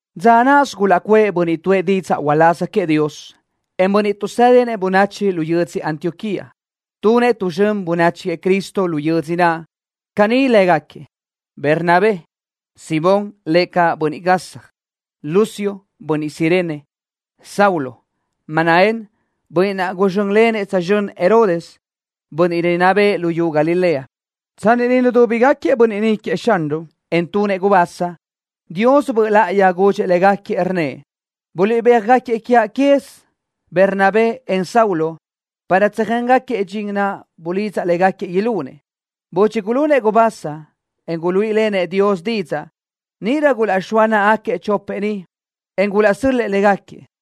Dza náʼasö gulaʼcuʼë bönniʼ tuʼë didzaʼ uláz queëʼ Dios, en bönniʼ tuʼsédinëʼ bönachi lu yödzö Antioquía, tunëʼ tu zxön bönachi queëʼ Cristo lu yödzö naʼ. Caní lë́gaquiëʼ: Bernabé, Simón, (lëʼ caʼ Bönniʼ Gasja), Lucio, (bönniʼ Cirene), Saulo, Manaén, (bönniʼ naʼ guzxö́nlenëʼ tsözxö́n Herodes, bönniʼ rinná bëʼë luyú Galilea). Tsanni niʼ nudúbigaquiëʼ bönniʼ ni queëʼ Xanruʼ, en tunëʼ gubasa, Dios Böʼ Láʼayi gudxëʼ légaquiëʼ, rnnëʼ: —Guliʼbéaj-gáquiëʼ quez quiaʼ Bernabé, en Saulo para tsöjéngaquiëʼ dxin naʼ bulidzaʼ légaquiëʼ ilunëʼ. Budxi gulunëʼ gubasa, en guluíʼilenëʼ Dios didzaʼ, níʼirö gulaʼxóa náʼagaquiëʼ chopëʼ ni, en gulaʼsö́l-lëʼë légaquiëʼ.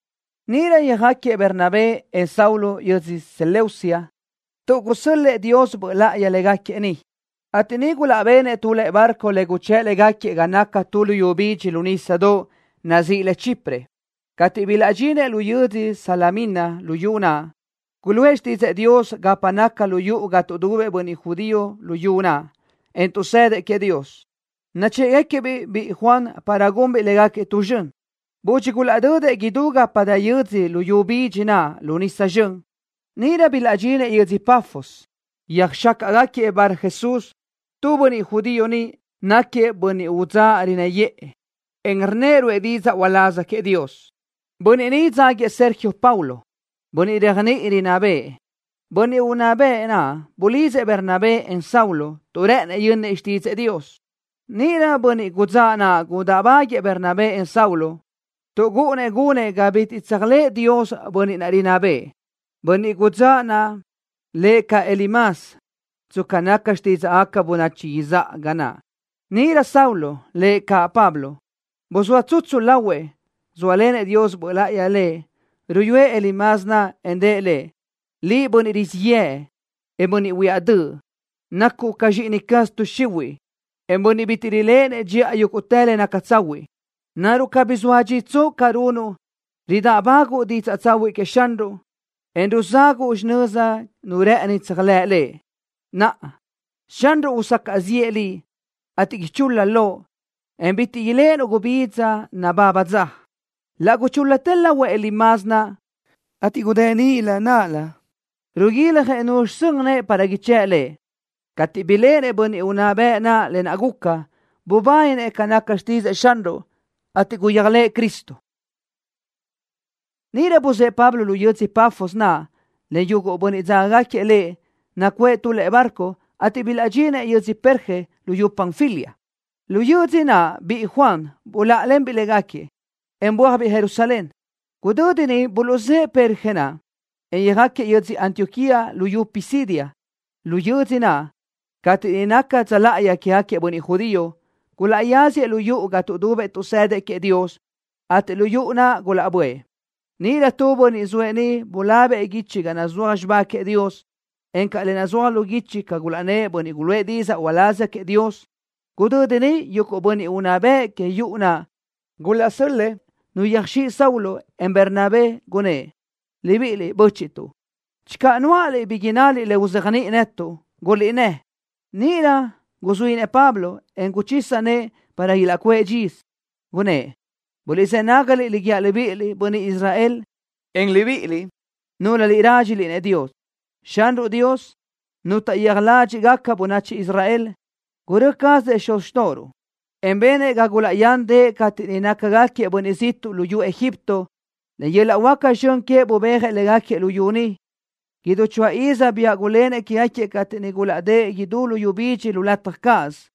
Níʼirö yöjáquiëʼ Bernabé, en Saulo yödzö Seleucia, tuʼ gusö́l-lëʼë Dios Böʼ Láʼayi légaquiëʼ niʼ, ateʼ niʼ gulaʼbenëʼ tu lëʼe barco le guchë́ʼ légaquiëʼ ga naca tu luyú bidxi lu nísadoʼ, nazíʼi le Chipre. Cateʼ bilaʼdxinëʼ lu yödzö Salamina luyú naʼ, guluʼë xtídzëʼë Dios gapa naca lu yuʼu ga tuʼdubëʼ bönniʼ judío luyú naʼ, en tuʼsëdëʼ queëʼ Dios. Nachë́ʼgaquiëʼ-biʼ biʼi Juan para gunbiʼ légaquiëʼ tu zxön. Budxi gulaʼdödëʼ idú gapa dë yö́dzödoʼ luyú bidxi naʼ lu nisa zxön, níʼirö bilaʼdxinëʼ yödzö Pafos. Yöjxácaʼgaquiëʼ Barjesús, tu bönniʼ judío niʼ. Náquiëʼ bönniʼ udzáʼ rinnë́ yëʼë, en rnnëʼ ruʼë didzaʼ uláz queëʼ Dios. Bönniʼ ni dzáguiëʼ Sergio Paulo, bönniʼ réajniʼi rinná bëʼë. Bönniʼ unná bëʼ naʼ bulidzëʼ Bernabé, en Saulo, tuʼ rë́ʼënëʼ yönnëʼ xtídzëʼë Dios. Níʼirö bönniʼ udzáʼ naʼ gudáʼbaguiëʼ Bernabé, en Saulo, tuʼ gúʼunnëʼ gunëʼ ga bitiʼ tséajlëʼë Dios bönniʼ rinná bëʼë. Bönniʼ udzáʼ naʼ lëʼ caʼ Elimas tsca naca xtídzaʼgaca bönachi izáʼa ga naʼ. Níʼirö Saulo, lëʼ caʼ Pablo, buzóa tsutsu lahuëʼ, zóalenëʼ Dios Böʼ Láʼayi lëʼ. Ruyúëʼ Elimas naʼ en rëʼ lëʼ: —Liʼ, bönniʼ rizíʼ yëʼ, en bönniʼ huiáʼ döʼ, nacuʼ ca zxíʼini caz tuʼ xihuiʼ, en bönniʼ bitiʼ riléʼenëʼ dxiʼa yúguʼtë le naca tsahuiʼ. ¿Naruʼ cabí soa dxitsoʼ ca runuʼ, ridáʼbaguʼu didzaʼ tsahuiʼ queëʼ Xanruʼ, en ruzáguʼu xinöza nu rë́ʼëni tséajlëʼ Lëʼ? Naʼa, Xanruʼ usacaʼ ziʼë liʼ, ateʼ ichul-la loʼ, en bitiʼ iléʼenuʼ gubidza nababa dza. Laʼ guchúl-latë lahuëʼ Elimas naʼ, ateʼ gudë́ʼ nilö náʼalö, riguiljëʼ nuzxi sön nëʼë para ichë́ʼ lëʼ. Cateʼ biléʼenëʼ bönniʼ unná bëʼ naʼ lë naʼ guca, bubáninëʼ ca naca xtídzëʼë Xanruʼ, ateʼ guyéajlëʼë Cristo. Níʼirö buzë́ʼë Pablo lu yödzö Pafos naʼ len yuguʼ bönniʼ dzágagaquiëʼ lëʼ, nacuʼë tu lëʼe barco, ateʼ bilaʼdxinëʼ yödzö Perge luyú Panfilia. Lu yödzö naʼ biʼi Juan buláʼalenbiʼ légaquiëʼ, en bö́ajbiʼ Jerusalén. Gudödi niʼ buluʼzë́ʼë Perge naʼ, en yöjáquiëʼ yödzö Antioquía luyú Pisidia. Lu yödzö naʼ, cateʼ niʼ naca dza láʼayi quégaquiëʼ bönniʼ judío, gulaʼyáziëʼ lu yuʼu ga tuʼdubëʼ tuʼsëdëʼ queëʼ Dios, ateʼ lu yuʼu naʼ gulaʼböʼë. Níʼirö tu bönniʼ zoëʼ niʼ bulabëʼ guichi ga nazúaj xibá queëʼ Dios, encaʼ le nazúaj lu guichi ca gulaʼnnë́ʼ bönniʼ guluʼë didzaʼ uláz queëʼ Dios. Gudödi niʼ yuguʼ bönniʼ unná bëʼ que yuʼu naʼ gulaʼsö́l-lëʼë nu yöjö́dx Saulo, en Bernabé, gunnë́ʼ: —Libiʼiliʼ, bö́chiʼtuʼ. Channö nuáʼaliʼ bi innaliʼ le uzéajniʼi netuʼ, guliʼnnë́. Níʼirö guzuínëʼ Pablo, en guchisa nëʼë para ilaʼcuʼë dxisö, gunnë́ʼ: —Buliʼzë́ nágaliʼ le guíaʼ libíʼiliʼ, bönniʼ Israel, en libíʼiliʼ, núlöliʼ rádxiliʼ-nëʼ Dios. Xanruʼ Dios, Nu taʼyéaj ládxiʼgaca bönachi Israel, gurö́ cazëʼ xuz xtóʼoruʼ, en benëʼ ga gulaʼyándëʼë cateʼ niʼ nácagaquiëʼ bönniʼ ziʼtuʼ luyú Egipto. Len yöl-laʼ huáca zxön queëʼ bubéajëʼ légaquiëʼ luyú niʼ. Idú choáʼ iz Dios biáʼ gulénëʼ quégaquiëʼ cateʼ niʼ gulaʼdë́ʼ idú luyú bidxi lu lataj cáʼasö.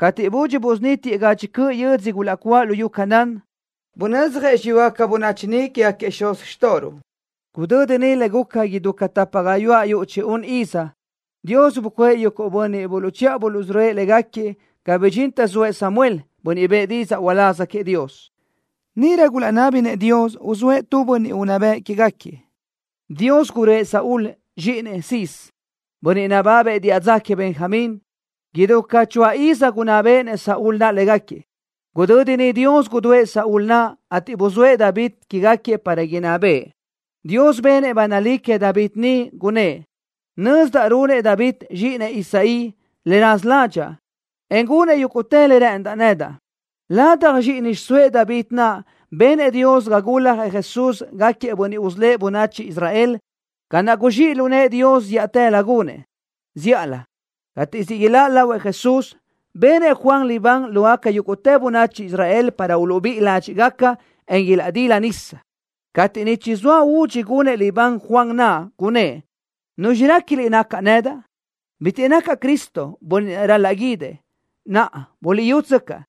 Cateʼ budxi busunítiëʼ gadxi cöʼ yödzö gulaʼcuáʼ luyú Canaán, bunödzjëʼ xiyúgaca bönachi niʼ quégaquiëʼ xuz xtóʼoruʼ. Gudödi niʼ, le guca idú ca tapa gayuáʼ yuʼ chi-un iz, Dios bucuʼë yuguʼ bönniʼ buluʼchiʼa buluʼsörö́ëʼ légaquiëʼ ga bidxintë zoëʼ Samuel, bönniʼ bëʼë didzaʼ uláz queëʼ Dios. Níʼirö gulaʼnábinëʼ Dios uzóëʼ tu bönniʼ unná bëʼ quégaquiëʼ. Dios gurö́ëʼ Saúl, zxíʼinëʼ Cis, bönniʼ nababëʼ diʼa dza queëʼ Benjamín. Idú ca choáʼ iz gunná béʼenëʼ Saúl naʼ légaquiëʼ. Gudödi niʼ Dios gudúëʼ Saúl naʼ, ateʼ buzóëʼ David quégaquiëʼ para inná bëʼë. Dios benëʼ ba nalí queëʼ David ni, gunnë́ʼ: “Nözdaʼ runëʼ David, zxíʼinëʼ Isaí, le raza ládxaʼa, en gunëʼ yúguʼtë le rë́ʼëndaʼ nedaʼ.” Ladaj zxíʼini xiʼsóëʼ David naʼ benëʼ Dios ga guljëʼ Jesús para gáquiëʼ bönniʼ usölë́ʼ bönachi Israel, ca naʼ guzxíʼ lu nëʼë Dios zíʼatëlö gunëʼ. Zíʼalö cateʼ siʼ iláʼ lahuëʼ Jesús, benëʼ Juan libán lógaca yúguʼtë bönachi Israel para uluʼbíʼi ládxiʼgaca, en ilaʼdila nisa. Cateʼ niʼ chizóa údxi gunëʼ libán Juan naʼ, gunnë́ʼ: “¿Nuzxi réquiliʼ nacaʼ nedaʼ? Bitiʼ nacaʼ Cristo, bönniʼ naʼ ral-laʼ guídëʼ. ¡Naʼa, buliʼyútsöcaʼ!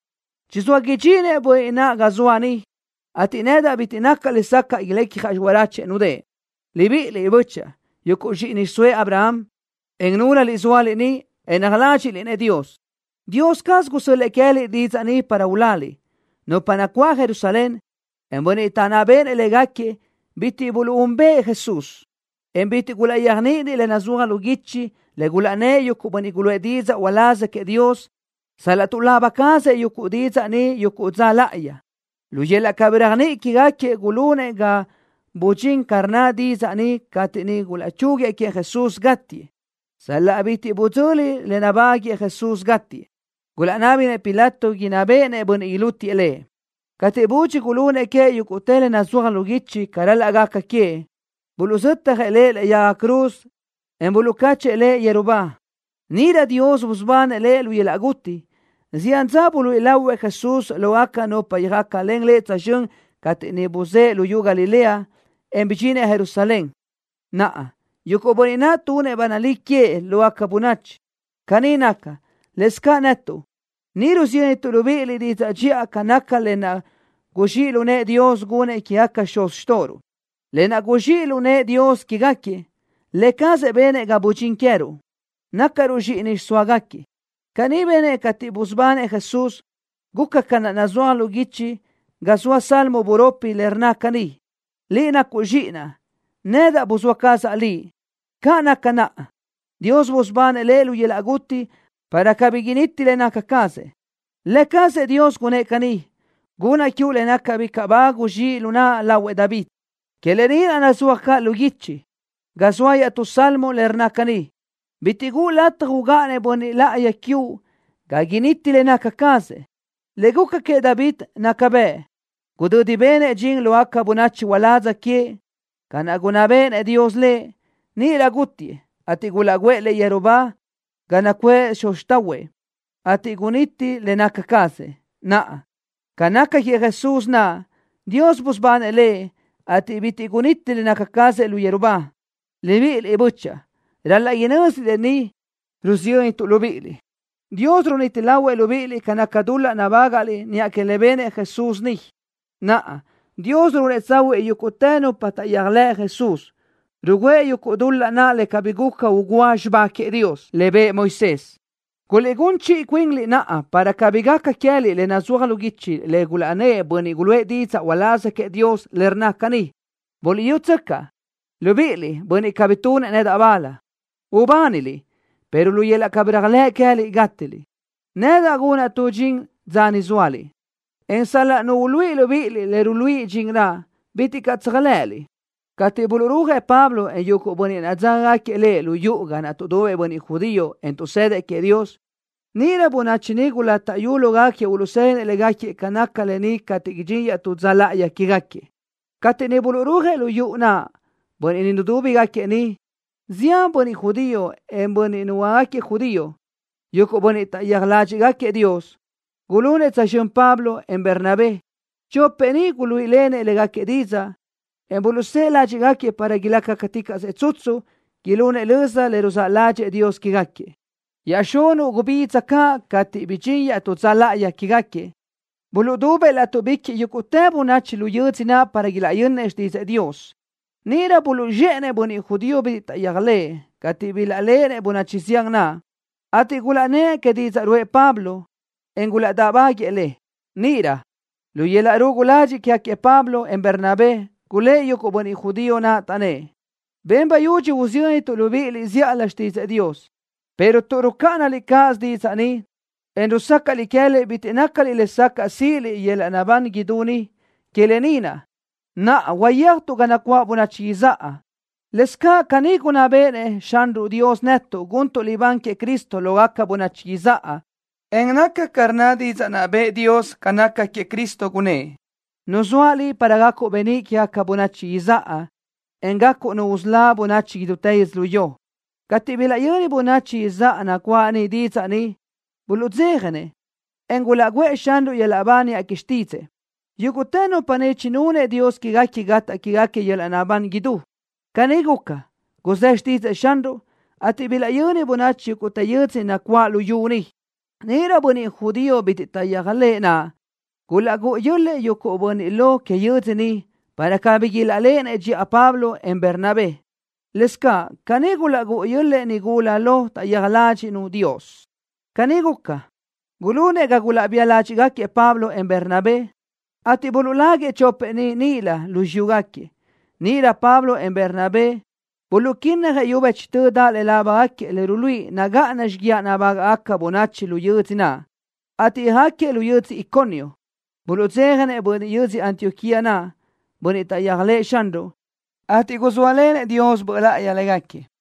Chizóëʼ idxinëʼ bönniʼ naʼ ga zoaʼ ni, ateʼ nedaʼ bitiʼ nacaʼ lesacaʼ ilecjaʼ xiráchuëʼ nudë́ʼë.” ’Libíʼiliʼ, bö́chaʼa, yuguʼ zxíʼini xiʼsóëʼ Abraham, en núlöliʼ zóaliʼ ni, en rádxiliʼ-nëʼ Dios. Dios caz gusö́l-lëʼë queë́liʼ didzaʼ ni para uláliʼ. Nupa nacuáʼ Jerusalén, en bönniʼ taʼnná béʼenëʼ légaquiëʼ bitiʼ buluʼúnbëʼë Jesús, en bitiʼ gulaʼyéajniʼinëʼ le nazúaj lu guichi le gulaʼnnë́ʼ yuguʼ bönniʼ guluʼë didzaʼ uláz queëʼ Dios, sal-laʼ tuʼlaba cazëʼ yuguʼ didzaʼ ni yuguʼ dza láʼayi. Lu yöl-laʼ cabí réajniʼi quégaquiëʼ gulunëʼ ga budxín ca rnna didzaʼ ni cateʼ niʼ gulaʼchúguiëʼ queëʼ Jesús gátiëʼ. Sal-laʼ bitiʼ budzöli le nabáguëʼë Jesús gátiëʼ, gulaʼnábinëʼ Pilato inná béʼenëʼ bönniʼ ilútiëʼ Lëʼ. Cateʼ budxi gulunëʼ queëʼ yúguʼtë le nazúaj lu guichi ca ral-laʼ gaca queëʼ, buluʼzötjëʼ Lëʼ lëʼe yaga cruz, en buluʼcáchëʼë Lëʼ yeru ba. ¡Níʼirö Dios busubanëʼ Lëʼ lu yöl-laʼ guti! Zián dza buluíʼi lahuëʼ Jesús lógaca nupa yöjácalen Lëʼ tsözxö́n cateʼ niʼ buzë́ʼë luyú Galilea, en bidxinëʼ Jerusalén. Naʼa, yuguʼ bönniʼ naʼ tunëʼ ba nalí queëʼ lógaca bönachi. ’Caní naca, lëscaʼ netuʼ ni rusiyöntuʼ libíʼiliʼ didzaʼ dxiʼa ca naca lë naʼ guzxíʼ lu nëʼë Dios gunëʼ quégaquiëʼ xuz xtóʼoruʼ. Lë naʼ guzxíʼ lu nëʼë Dios quégaquiëʼ, Lë cazëʼ benëʼ ga budxín queë́ruʼ, nácaruʼ zxíʼini xiʼsóagaquiëʼ. Caní benëʼ cateʼ busubanëʼ Jesús. Guca ca naʼ nazúaj lu guichi ga zoa salmo buropi, le rnna caní: “Liʼ nacuʼ Zxíʼinaʼ. Nedaʼ buzóa cazaʼ Liʼ.” Ca naca naʼ, Dios busubanëʼ Lëʼ lu yöl-laʼ guti para cabí initi le naca cazëʼ, Lë cazëʼ Dios gunnë́ʼ caní: “Gunnaʼ quiuʼ le nácagaca bicaʼ ba guzxíʼ lu naʼa lahuëʼ David.” Que lë ni naʼ nazúaj caʼ lu guichi, ga zoa iaʼtú salmo, le rnna caní: “Bitiʼ guʼu lataj ugáʼanëʼ bönniʼ láʼayi quiuʼ ga initi le naca cazëʼ.” Le guca queëʼ David naca bëʼ. Gudödi benëʼ dxin lógaca bönachi uládz queëʼ, ca naʼ gunná béʼenëʼ Dios lëʼ, níʼirö gútiëʼ, ateʼ gulaʼguʼë lëʼ yeru ba ga nacuʼë xuz xtáʼahuëʼ, ateʼ guniti le naca cazëʼ. Naʼa, ca naca queëʼ Jesús naʼ, Dios busubanëʼ Lëʼ, ateʼ bitiʼ guniti le naca cazëʼ lu yeru ba. Libíʼiliʼ, bö́chaʼa, ral-laʼ inö́ziliʼ lë ni rusiyöntuʼ libíʼiliʼ. Dios runiti lahuëʼ libíʼiliʼ ca naca dul-laʼ nabágaʼliʼ niʼa que le benëʼ Jesús ni. Naʼa, Dios ruúnëʼ tsahuiʼ yúguʼtë nupa taʼyéajlëʼ Jesús, rugǘëʼ yuguʼ dul-laʼ naʼ le cabí guca ugúa xibá queëʼ Dios, le bëʼë Moisés. Guliʼgún chiʼi cuinliʼ naʼa para cabí gaca queë́liʼ le nazúaj lu guichi le gulaʼnnë́ʼ bönniʼ guluʼë didzaʼ uláz queëʼ Dios, le rnna caní: Buliʼyútsöcaʼ, libíʼiliʼ, bönniʼ cabí tunëʼ nedaʼ bal. Ubániliʼ, pero lu yöl-laʼ cabí réajlëʼ queë́liʼ gátiliʼ. Nedaʼ gunaʼ tu dxin dza ni zóaliʼ, en sal-laʼ nu uluíʼi libíʼiliʼ le ruluíʼi dxin naʼ, bitiʼ caʼ tséajlëʼëliʼ. Cateʼ buluʼrúajëʼ Pablo, en yuguʼ bönniʼ naʼ dzágagaquiëʼ lëʼ lu yuʼu ga naʼ tuʼdubëʼ bönniʼ judío, en tuʼsëdëʼ queëʼ Dios, níʼirö bönachi niʼ gulátaʼyu lógaquiëʼ uluʼsë́dinëʼ légaquiëʼ ca naca lë ni cateʼ idxín iaʼtú dza láʼayi quégaquiëʼ. Cateʼ niʼ buluʼrúajëʼ lu yuʼu naʼ bönniʼ nudúbigaquiëʼ niʼ, zián bönniʼ judío, en bönniʼ nuhuöácagaquiëʼ judío, yuguʼ bönniʼ taʼyéaj ládxiʼgaquiëʼ Dios, gulunëʼ tsözxö́n Pablo, en Bernabé. Chopëʼ ni guluíʼilenëʼ légaquiëʼ didzaʼ, en buluʼsë́ʼë ládxiʼgaquiëʼ para ilácaticaʼsëʼ tsutsu, ilunëʼ löza le ruzáʼ ládxëʼë Dios quégaquiëʼ. Iaʼxunuʼ gubidza caʼ cateʼ bidxín iaʼtú dza láʼayi quégaquiëʼ, buluʼdubëʼ látuʼbiquiʼ yúgutë bönachi lu yödzö naʼ para ilaʼyönnëʼ xtídzëʼë Dios. Níʼirö buluʼzxéʼenëʼ bönniʼ judío bitiʼ taʼyéajlëʼë, cateʼ bilaʼléʼenëʼ bönachi zián naʼ, ateʼ gulaʼnnë́ʼ que didzaʼ ruʼë Pablo, en gulaʼdáʼbáguëʼë le. Níʼirö lu yöl-laʼ rugu ladxiʼ quégaquiëʼ Pablo, en Bernabé, gulë́ʼ yuguʼ bönniʼ judío naʼ, taʼnnë́ʼ: —Ben bayudxi usiyöntuʼ libíʼiliʼ zíʼalö xtídzëʼë Dios, pero tuʼ rucáʼanaliʼ cáʼasö didzaʼ ni, en rusácaʼliʼ queë́liʼ bitiʼ nácaliʼ lesacaʼ síʼiliʼ yöl-laʼ naʼbán idú ni, que lë ni naʼ, naʼa uyéajtuʼ ga nacuáʼ bönachi izáʼa. Lëscaʼ caní gunná béʼenëʼ Xanruʼ Dios netuʼ guntuʼ libán queëʼ Cristo lógaca bönachi izáʼa, en naca ca rnna didzaʼ naʼ bëʼë Dios ca naca queëʼ Cristo, gunnë́ʼ: Nuzóaʼ Liʼ para gacuʼ beníʼ quégaca bönachi izáʼa, en gacuʼ Nu usölá bönachi idútë yödzölió. Cateʼ bilaʼyöni bönachi izáʼa nacuáʼ niʼ didzaʼ ni, buluʼdzéjanëʼ, en gulaʼguʼë Xanruʼ yöl-laʼ ba niʼa que xtídzëʼë, yúguʼtë nupa niʼ chinunëʼ Dios quéguequi gataʼ quéguequi yöl-laʼ naʼbán idú. Caní guca, guzë́ xtídzëʼë Xanruʼ, ateʼ bilaʼyöni bönachi yúguʼtë yödzö nacuáʼ luyú niʼ. Níʼirö bönniʼ judío bitiʼ taʼyéajlëʼë naʼ gulaʼgúʼu yö́l-lëʼë yuguʼ bönniʼ lo que yödzö niʼ para cabí ilaʼléʼenëʼ dxiʼa Pablo, en Bernabé. Lëscaʼ caní gulaʼgúʼu yö́l-lëʼë nigula lo taʼyéaj ládxiʼnu Dios. Caní guca, gulunëʼ ga gulaʼbía ládxiʼgaquiëʼ Pablo, en Bernabé, ateʼ buluʼláguëʼ chopëʼ ni níʼilö lu xiyúgaquiëʼ. Níʼirö Pablo, en Bernabé buluʼquínnajëʼ yu bëchtö daʼ laʼ lábagaquiëʼ le ruluíʼi nagáʼana xíguiaʼ nabágaʼgaca bönachi lu yödzö naʼ, ateʼ yöjáquiëʼ lu yödzö Iconio. Buluʼdzéjanëʼ bönniʼ yödzö Antioquía naʼ, bönniʼ taʼyéajlëʼë Xanruʼ, ateʼ guzóalenëʼ Dios Böʼ Láʼayi légaquiëʼ.